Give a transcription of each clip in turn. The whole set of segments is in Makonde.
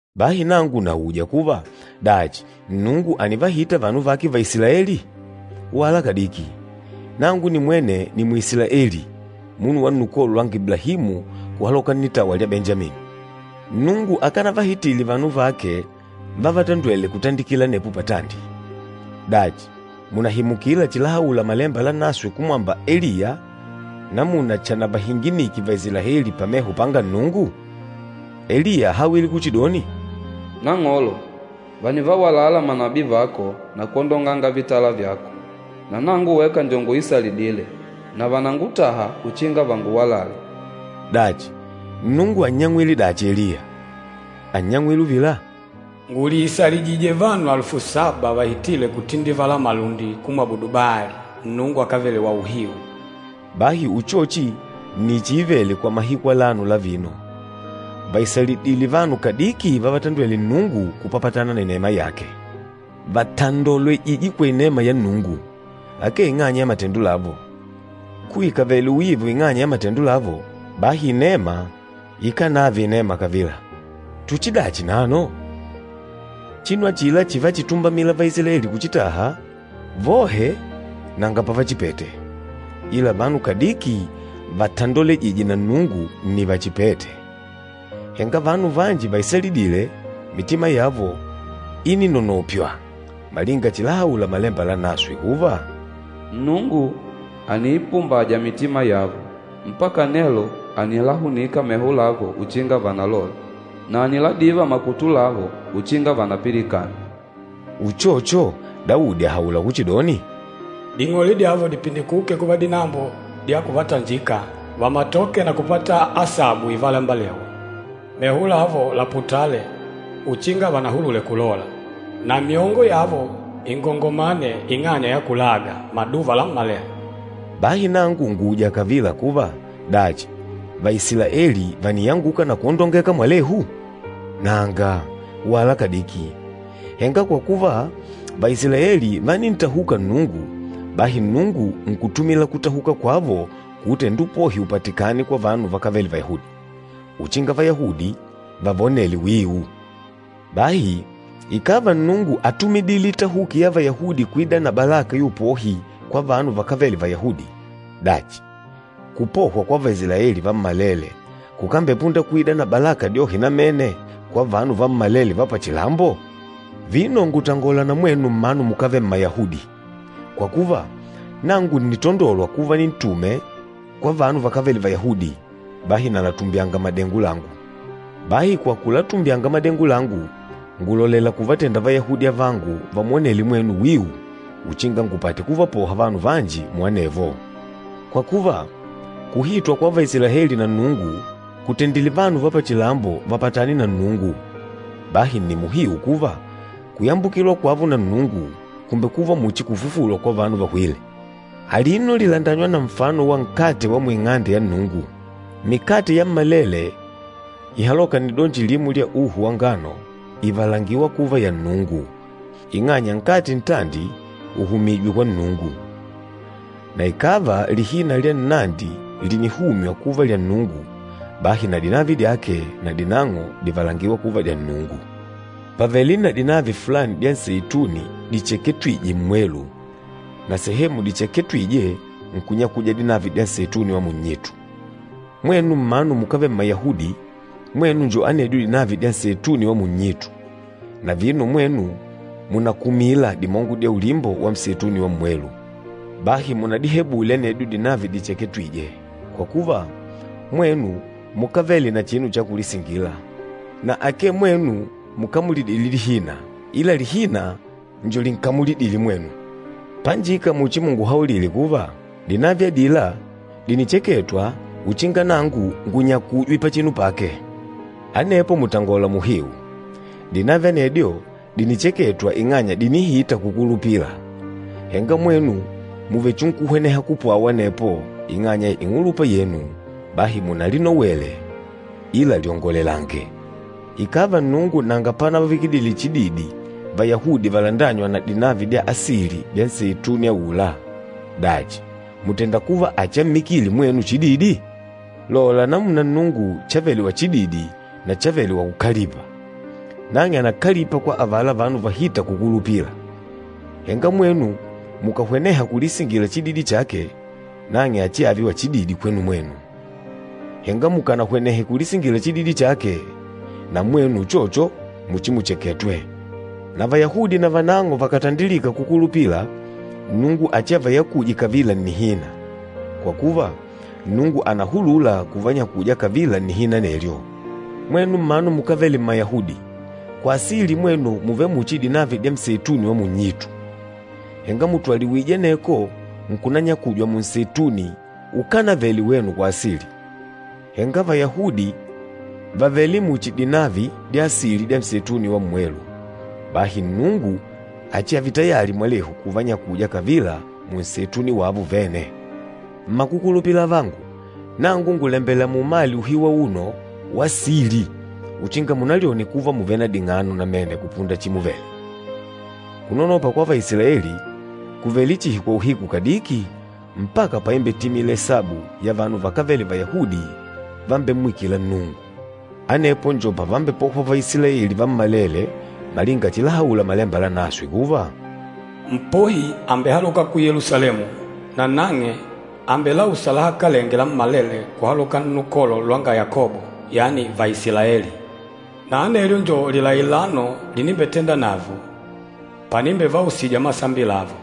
Bahi nangu nauja kuva, dachi Nnungu ànivahita vanu vake Vaisilaeli? Wala kadiki! Nangu nimwene ni Mwisilaeli, munu wa nnukolo lwanga Iblahimu kuhaloka nnitawa lwa Benjamini. Nnungu akanavahitile vanu vake vávatondwèlè kutandikila anepo patandi. Dachi, mùnahimukila chilahaula Malemba Lanaswe kumwamba Eliya namuna chanavahinginike Vaisilaeli pameho panga Nnungu? Eliya áhawile kuchidoni, “Nang'olo, vànivawalala manabii vako na kwondonganga vitala vyako. Na nangu weka njo nguisalidîle, na vànangutaha uchinga vanguwalale.” Dachi, Nnungu ánnyang'wile dachi Eliya? Ánnyang'wile uvila, “Ngùliisalijijije vanu alufu saba vahitîle kutindivala malundi kumwabudu Baali, nnungu akávele wauhiu.” Bahi uchochi nni chiivele kwa mahiku alano la vino, vàisalidile vanu kadiki vávatondwèlè Nnungu kupapatana na inema yake. Vàtandolwejije kwa inema ya Nnungu, akee ing'anya ya matendo lavo. Kuikavele uiva ing'anya ya matendo lavo, bahi inema ikánave inema kavila. Tuchidachi nano? Chinu achila chívachitumbamila Vaisilaeli kuchitaha, vohe nanga pavachipete. Ila vanu kadiki vátandolwejìjè na Nnungu nni vachipête. Henga vanu vanji vaisalidîle, mitima yavo íninonopywa, malinga chilahaula Malemba Lanaswe kuva, “Nnungu àniipumbaja mitima yavo. Mpaka nelo ànilahunika meho lavo uchinga vanalole, na àniladiva makutu lavo uchinga vanapilikane.” Uchocho, Daudi àhaula kuchidoni, “Ding'ole dyavo dipindikuke kuva dinambo dya kuvatanjika, vamatoke na kupata asabu ivalembelewa. Meho lavo laputale, uchinga vanahulule kulola. Na myongo yavo ingongomane ing'anya ya kulaga, maduva lammalele.” Bahi nangu ngùuja kavila kuva, dachi, Vaisilaeli vàniyanguka na kwondongeka mwalehu? Nanga, wala kadiki! Henga kwa kuva, Vaisilaeli vánintahuka Nnungu, bahi Nnungu nkutumila kutahuka kwavo kuutenda upohi upatikane kwa vanu vakávele Vayahudi, uchinga Vayahudi vavonele wiu. Bahi ikàva Nnungu átumidile itahuki ya Vayahudi kuida na balaka ya upohi kwa vanu vakávele Vayahudi, dachi kupohwa kwa Vaisilaeli vammalele kukambepunda kuida na balaka dyohe namene kwa vanu vammalele va pachilambo? Vino ngùtangola na mwenu mmanu mukávele Mmayahudi. Kwa kuva, nangu ǹnitandolwa kuva nintume kwa vanu vakávele Vayahudi, bahi nalatumbyanga madengo langu. Bahi kwa kulatumbyanga madengo langu, ngùlolela kuvatenda Vayahudi avangu vamwonele mwenu wiu uchinga ngupate kuvapoha vanu vanji muanevo. Kwa kuva, kuhitwa kwa Vaisilaeli na Nnungu kùtendile vanu va pachilambo vapatane na Nnungu, bahi nni muhiu kuva kuyambukilwa kwavo na Nnungu, kùmbekuva muchi kufufulwa kwa vanu vahwîle. Alino lìlandanywa na nfano wa nkate wa muing'ande ya Nnungu. Mikate yammalele ihalôka nnidonji limo lya uhu wa ngano ìvalangiwa kuva ya Nnungu ing'anya nkate ntandi ùhumijwe kwa Nnungu. Na ikàva lihina lya nnandi lìnihumywa kuva lya Nnungu, bahi na dinavi dyake nadinang'o dìvalangiwa kuva dya Nnungu. Pàvele na dinavi fulani dya nseituni dicheketwije mmwelu, na sehemu dicheketwije nkunyakuja dinavi dya nseituni wa munnyitu. Mwenu mmanu mukávele Mmayahudi, mwenu njo anedyo dinavi dya nseituni wa munnyitu, na vino mwenu mùnakumila dimongo na ulimbo wa nseituni wa mmwelu. Bahi munadihebule anedyo dinavi dicheketwîje. Kwa kuva, mwenu mukávele na chinu cha kulisingila, na akee mwenu mukamulidîle lihina ila lihina njo linkamulidîle mwenu. Panjika muchimunguhaulile kuva, “Dinavi adila, dìnicheketwa uchinga nangu ngunyakujwe pachinu pake.” Anepo, mùtangola muhiu. Dinavi anedyo, dìnicheketwa ing'anya dìnihita kukulupila, henga mwenu mùvechinkuhweneha kupwawa anepo ing'anya ya ing'ulupa yenu, bahi, munalinowe ila lyongolelange. Ikàva Nnungu nanga panavavikidile chididi Vayahudi valandânywa na dinavi dya asili dya nseituni aula, dachi mùtenda kuva achiammikile mwenu chididi? Lola namuna Nnungu chavele wachididi na chavele wakúkalipa. Nang'e ànakalipa kwa avala vanu vahîta kukulupila, henga mwenu mukàhweneha kulisingila chididi chake, nang'e achiave wachididi kwenu mwenu. Henga mukànahwenehe kulisingila chididi chake, na mwenu uchocho muchimucheketwe. Na Vayahudi navanang'o vakàtandilika kukulupila, Nnungu achiavanyakuje kavila nnihina, kwa kuva Nnungu ànahulula kuvanyakuja kavila nnihina anelyo. Mwenu mmanu mukávele Mmayahudi, kwa asili mwenu mùvele muchi dinavi dya nseituni wa munnyitu, henga mùtwaliwije aneko nkunanyakujwa munseituni ukánavele wenu kwa asili. Henga Vayahudi vàvele muchi dinavi dya asili dya nseituni wa mmwelu, bahi Nnungu achiave tayali mwalehu kuvanyakuja kavila munseituni wavo vene. Mmakukulupila avangu, nangu ngùlembela muumale uhiu auno wa sili uchinga munalyone kuva mùvele na ding'ano namene kupunda chimuvele. Kunonopa kwa Vaisilaeli kùvele chihi kwa uhiku kadiki mpaka paimbetimila isabu ya vanu vakávele Vayahudi vambemmwikîla Nnungu. Anepo njo pavambepohwa Vaisilaeli vammalele malinga chilahaula Malemba Lanaswe kuva, “Mpohi àmbehaloka ku Yelusalemu, nanang'e àmbelausa lahakalenge lammalele kuhaloka nnukolo lwanga Yakobo, yani Vaisilaeli. Na anelyo njo lilailano linimbetenda navo, panimbevausija masambi lavo.”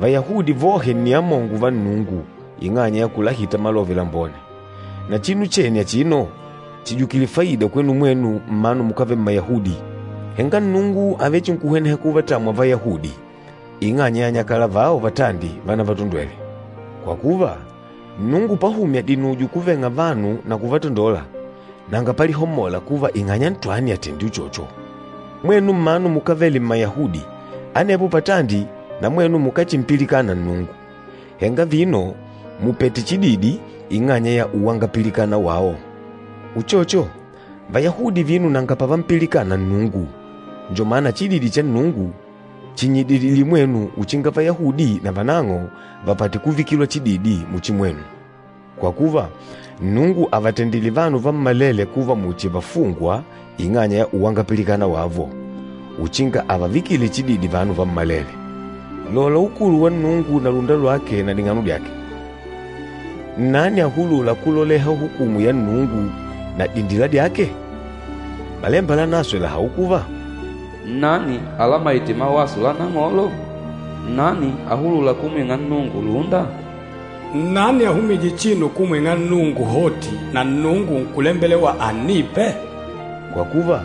Vayahudi vohe nni amongo va Nnungu ing'anya ya kulahita Malove Lambone, na chinu chene achino chìjukile faida kwenu mwenu mmanu mukávele Mmayahudi. Henga Nnungu àvechinkuhweneha kuvatamwa Vayahudi ing'anya ya anyakala vao vatandi vanavatondwêle. Kwa kuva, Nnungu pahumya dinujo kuveng'a vanu na kuvatandola, nanga palihomola kuva ing'anya ntwani àtendile uchocho. Mwenu mmanu mukávele Mmayahudi, anepo patandi na mwenu mukáchimpilikana Nnungu, henga vino mùpete chididi ing'anya ya uwangapilikana wao. Uchocho, Vayahudi vino nanga pavampilikana Nnungu njo mana chididi cha Nnungu chinnyidilidile mwenu uchinga Vayahudi navanang'o vapate kuvikilwa chididi muchi mwenu. Kwa kuva, Nnungu àvatendile vanu vammalele kuva muchi vafungwa ing'anya ya uwangapilikana wavo, uchinga àvavikile chididi vanu vammalele. Lola ukulu wa Nnungu na lúnda lwake na ding'ano dyake! Nnani ahulûla kuloleha hukumu ya Nnungu na dindila dyake? Malemba Lanaswe làhaula kuva, “Nnani alamaîte mawaso la Nang'olo? Nnani ahulûla kumwing'a Nnungu lúnda?” “Nnani ahumîje chinu kumwing'a Nnungu hoti, na Nnungu nkulembelewa annipe?” Kwa kuva,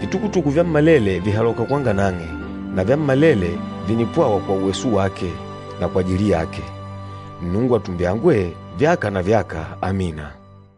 vitukutuku vyammalele vìhaloka kwanga nang'e, na vyammalele vìnipwawa kwa uweso wake na kwajili yake. Nnungu atumbyangwe, vyaka na vyaka! Amina.